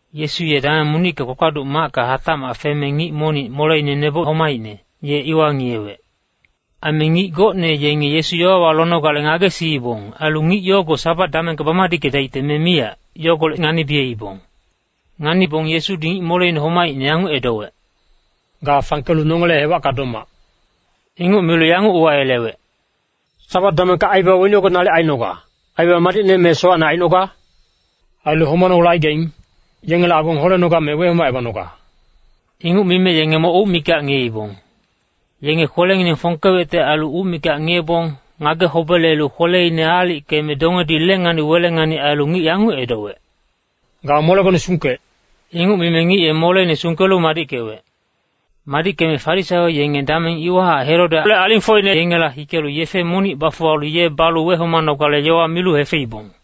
Yesu ye dameng monicka kpakpaduc macka hatacmac feme ngic monic moleine neboc homaicne, ye iwa ngiyewec. Aime ngic gocne yenge Yesu yowawa lonogale ngagesiibong. Ailu ngic yogo Sabat damengka bamadickedaicte me miyac, yogolec nganibiyeibong. Nganibong Yesudi ngic moleine homaicne yanguc edowec, “Ga fangkelu nongele hewacka domac.” Inguc milu yanguc uwayelewec, “Sabat damengka aibaba weni yogo nalic ainoga, aibaba madicne me sowacne ainoga? Ailu homanogale aigaing, yengele agong holenoga me wehomacebanoga?” Inguc mime yenge moc uc mikac ngiyeibong. Yenge kwelengineng fongkewecte ailu uc mikac ngiyebong, ngage-hobelelu kweleine aalickeme dongedi lengani-welengani ailu ngic yanguc micnowec, “Ga molegone sungkec!” Inguc mime ngic ye moleine sungkelu madickewec. Madickeme Farisaio yenge dameng iwahac Herodele alingfocine yengela hikelu yefe monic bafuwalu ye balu wehomanogale yowa milu hefeibong.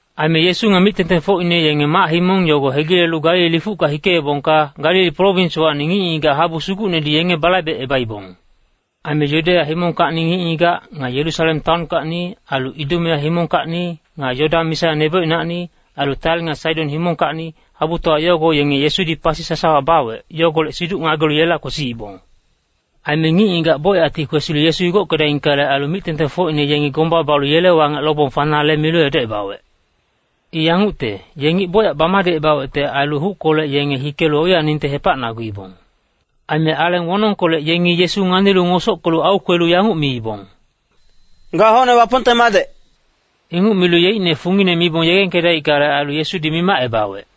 Aime Yesu nga mic-tengtengfocine yenge mac-himong yogo hegilelu Galili lifucka hikeebongka, Galili prowinswacni ngic-ngigac habu sugucnedi yenge balaibecebaibong. Aime Yudeya himongkacni ngic-ngigac, nga Yerusalem taonkacni, ailu Idumea himongkacni, nga Yodan misa nebocinacni, ailu Tair nga Saidon himongkacni, habutowa yogo yenge Yesudi pasi sasawa bawec, yogolec siduc ngagelu yela kwesiibong. Aime ngic-ngigac bocyacti kwesilu Yesu igockedaingkale ailu, mic-tengtengfocine yengi gomba balu yele wangec lobong fanale milu edocebawec. I yangucte, ye ngic bocyac bamadicebawecte ailu huckolec yenge hikelu oiyaningte hepacnaguibong. Aime aleng wonongkolec yengi Yesu nganilu ngosockelu aukwelu yanguc miibong, “Ga hocne Wapongte madec.” Inguc milu yeicne fungine mibong yegengkedaickale ailu, Yesudi mimacebawec.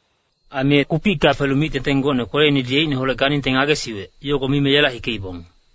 Aime ye kupicka felu mic-tengteng gocne kweleinedi yeicneholec ganingte ngagesiwec, yogo mime yela hikeibong.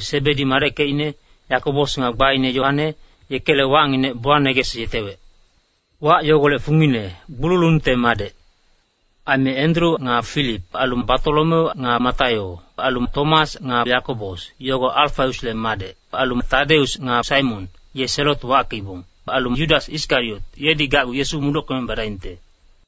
Sebedi madeckecine, Yakobos nga gbaine Yoane, yekele wacnginec Boaneges yetewec. Wac yogolec fungine, gbululungte madec. Aime Endru nga Filip. Ailu Batolomeu nga Mataio. Ailu Tomas nga Yakobos, yogo Alfaiusle madec. Ailu Tadeus nga Saimon, ye Selot wackeibong. Ailu Yudas Iskariot, yedi gacgu Yesu mudockeme badaingte.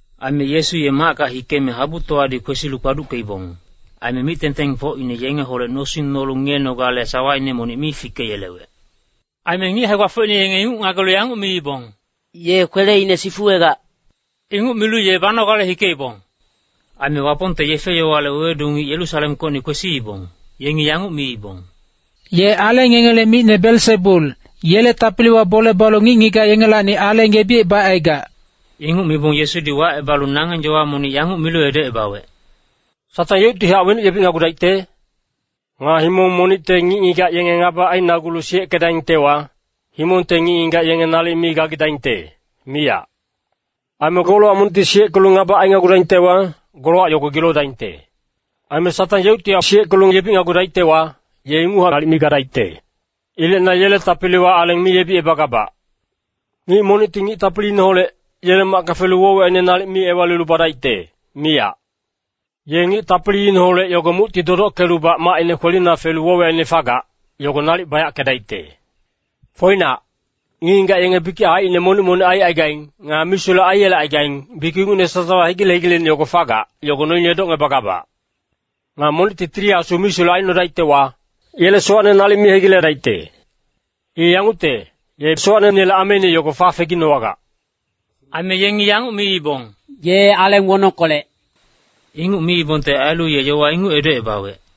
Aime Yesu ye macka hikeme habutowadi kwesilu kpaduckeibong. Aime mic-tengtengfocine yengeholec nosing nolu ngiyenogale sawaine monic mi fikeyelewec. Aime ngic hae-gbafocine yenge inguc ngagelu yanguc miibong, “Ye kweleine sifuwegac.” Inguc milu ye banogale hikeibong. Aime Wapongte yefe-yowale wewedu ngic Yerusalemkocni kwesiibong, yengi yanguc miibong, “Ye aleng yengele micne Belsebul, yele tapiliwa bole balu ngic-ngigac yengelacni aleng yebicebacaigac.” Inguc mibong Yesudi wacebalu nangeng yowa monic yanguc milu edocebawec, “Satang yeuctihac wenuc yebicnagudaicte? Nga himong monicte ngic-ngigac yenge ngaba ainagulu siyeckedaingtewa, himongte ngic-ngigac yenge nalic mi gagidaingte, miyac. Aime golowac monicti siyeckelu ngaba ainagudaingtewa, golowac yogo gilodaingte. Aime Satang yeuctihac siyeckelu yebicnagudaictewa, ye inguchac nalic mi gadaicte. Ilec na yele tapiliwa aleng mi yebicebagabac. “Ngic monicti ngic tapiliineholec, yele macka felu woc-wiyacine nalic mi ewalilu badaicte, miyac. Ye ngic tapiliineholec yogo mucti dodockelubac macine kwelina felu woc-wiyacine fagac, yogo nalic bayackedaicte. “Foinac, ngic-ngigac yenge bikic haicine monic-monic aicaigaing, nga misulec aiyelecaigaing. Bikic ingucne sasawa, hegile-hegileine yogo fagac, yogo noine edocngebagabac. Nga monicti Tili Asu misulec aicnodaictewa, yele sowacne nalic mi hegiledaicte. I yangucte, ye sowacneinele ameine yogo fafeginowagac.” Aime yengi yanguc miibong, “Ye aleng wonongkolec.” Inguc miibongte ailu ye yowa inguc edocebawec.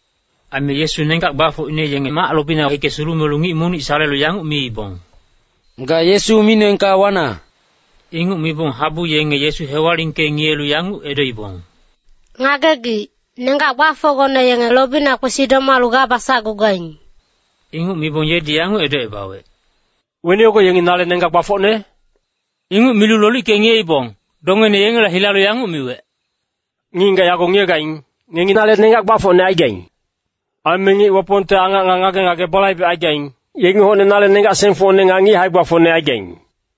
Aime Yesu nenggac gbafocine yenge mac lobina hike sulumelu ngic monic salelu yanguc miibong, “Ga Yesu micnoengka wana.” Inguc mibong habu yenge Yesu hewalingke-ngiyelu yanguc edoibong, “Ngagegic, nenggac gbafocgone yenge lobina kwesi domalu ga basacgugaing.” Inguc mibong yedi yanguc edocebawec, “Weni yogo yengi nale nenggac gbafocne?” Inguc milu lolicke-ngiyeibong, dongeine yengela hilalu yanguc miwec, “Ngic-ngigac yago ngiyegaing, ngengi nale nenggac gbafocne aigaing. Aime ngic Wapongte angac nga ngage-ngage balaibecaigaing, yengi hocne nale nenggac-sengfocne nga ngic hae-gbafocne aigaing.”